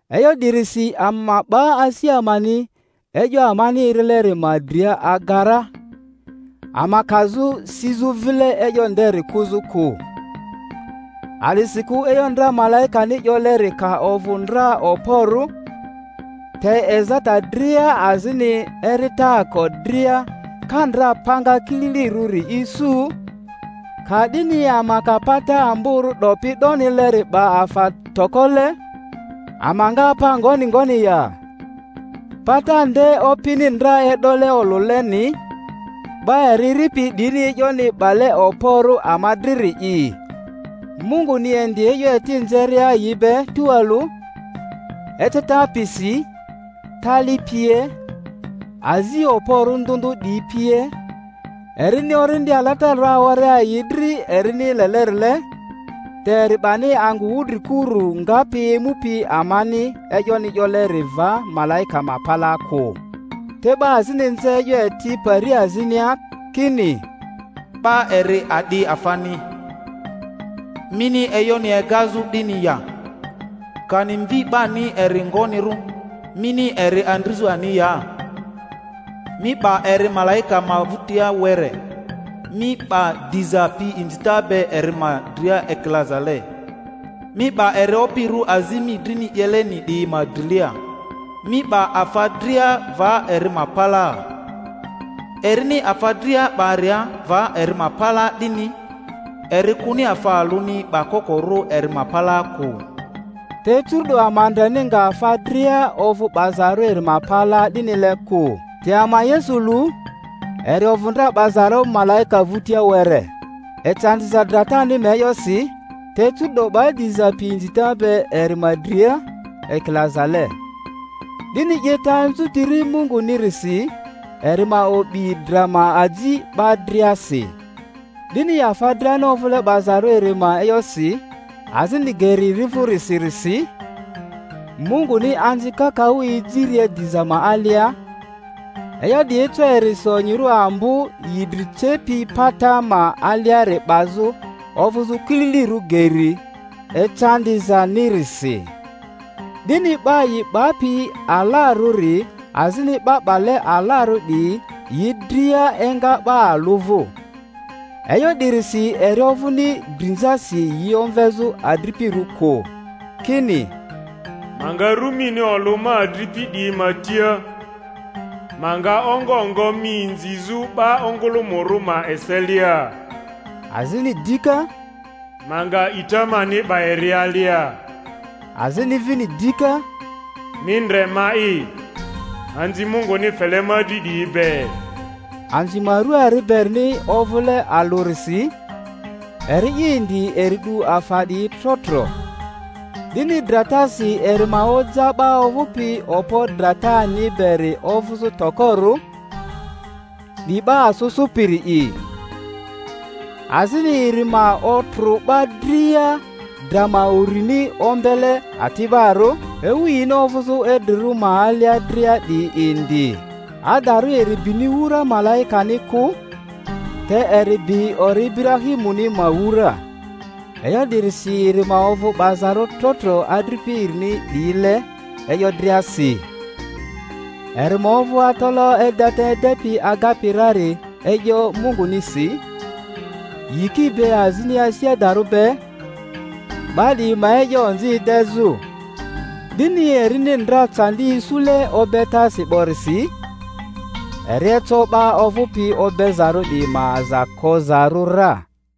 E'yo 'dirisi ama ma 'ba asi amani e'yo amani erileri ma dria aga ra, ama kazᴜ sizᴜ vile e'yo nderi kᴜzᴜ kᴜ. A'disikᴜ e'yo ndra malaikani 'yoleri ka ovᴜ ndra okporᴜ, te ezata dria azini eritaako dria ka ndra panga kililirᴜri isu, ka'dini ama ka pata amborᴜ 'dopi 'donileri 'ba afa tokole' ama nga apa ngoni ngoni ya? Pata nde Opini ndra e'dole olᴜleni, 'ba eri eripi 'diyini e'yoni 'bale okporᴜ ama driri’i, Munguni indi e'yo eti nzeria yi be tualᴜ, eceta piyisi, tali pie, azi okporᴜ ndᴜ ndᴜ 'diyi pie, erini Orindi Alatararᴜ awaria yi dri erini lelerile. Te eri 'bani angᴜ wudrikuru ngapi emupi amani e'yoni 'yoleri va malaika ma palaa kᴜ. Te 'ba azini nze e'yo eti pari azinia, kini, 'Ba eri a'di afani, mini e'yoni egazᴜ 'dini ya? Kani mvi 'bani eri ngonirᴜ, mini eri andrizᴜ ani ya? Mi 'ba eri malaika ma vᴜtia were, mi 'ba diza pi inzita be eri ma dria ekilazale, mi 'ba eri opirᴜ azi mi drini 'yeleni 'diyi ma drilia; mi 'ba afa dria va eri ma palaa. Erini afa dria 'baria va eri ma palaa 'dini, eri kᴜni afa alᴜni 'bakokorᴜ eri ma palaa kᴜ. Te curu'do ama ndreni nga afa dria ovᴜ 'bazarᴜ eri ma palaa 'dinile kᴜ. Te ama Yesu lu, eri ovᴜ ndra 'bazarᴜ malaika vᴜtia were, ecandiza dratani ma e'yosi, te curu'do 'ba diza pi inzita be eri ma dria ekilazale, 'dini 'yeta anzutiri Mungunirisi eri ma o'bi dra ma aji 'ba driasi. 'Dini afa driani ovᴜle 'bazarᴜ eri ma e'yosi, azini geri eri vᴜrisirisi, Munguni anzi kakaᴜ ejiria diza ma alia, e'yo 'di eco erisi onyirᴜ ambo yi dri cepi pata ma aliari 'bazᴜ ovᴜzᴜ kililirᴜ geri ecandizanirisi. 'Di-ni 'ba yi 'bapi alarᴜri azini 'ba 'bale alarᴜ 'diyi yi dria enga 'ba alᴜ vᴜ. E'yo 'dirisi eri ovᴜni drinzasi yi omvezᴜ adripirᴜ kᴜ, kini, Ma nga ru mini olᴜ ma adripi 'diyi ma tia, ma nga ongo ngo mi inzizᴜ 'ba ongᴜlᴜmᴜrᴜ ma eselia. Azini dika, Ma nga a'ita mani 'ba eri alia. Azini vini dika, Mi ndre, ma'i, anzi Munguni fele ma dri 'diyi be. Anzi ma rua ari berini ovᴜle alᴜrisi, eri'i indi eri 'du afa 'diyi tro tro, 'dini dratasi eri ma oja 'ba ovᴜpi okpo dratani beri ovᴜzᴜ tokorᴜ, 'di 'ba asᴜ sᴜpiri'i; azini eri ma otrᴜ 'ba dria dra ma urini ombele ati'barᴜ, ewu yini ovᴜzᴜ idrirᴜ ma alia dria 'diyi indi. Adarᴜ eri bini wura malaikani kᴜ, te eri bi ori Iburahimuni ma wura. E'yo 'dirisi eri ma ovᴜ 'bazarᴜ tro tro adripi erini 'diyile e'yo driasi, eri ma ovᴜ atalaᴜ edeta edepi agapi rari e'yo Mungunisi, yiki be azini asi adarᴜ be, 'ba 'diyi ma e'yo onzi edezᴜ. 'Dini erini ndra candi isule obetasi 'borisi, eri eco 'ba ovᴜpi obezarᴜ 'diyi ma aza kozarᴜ ra.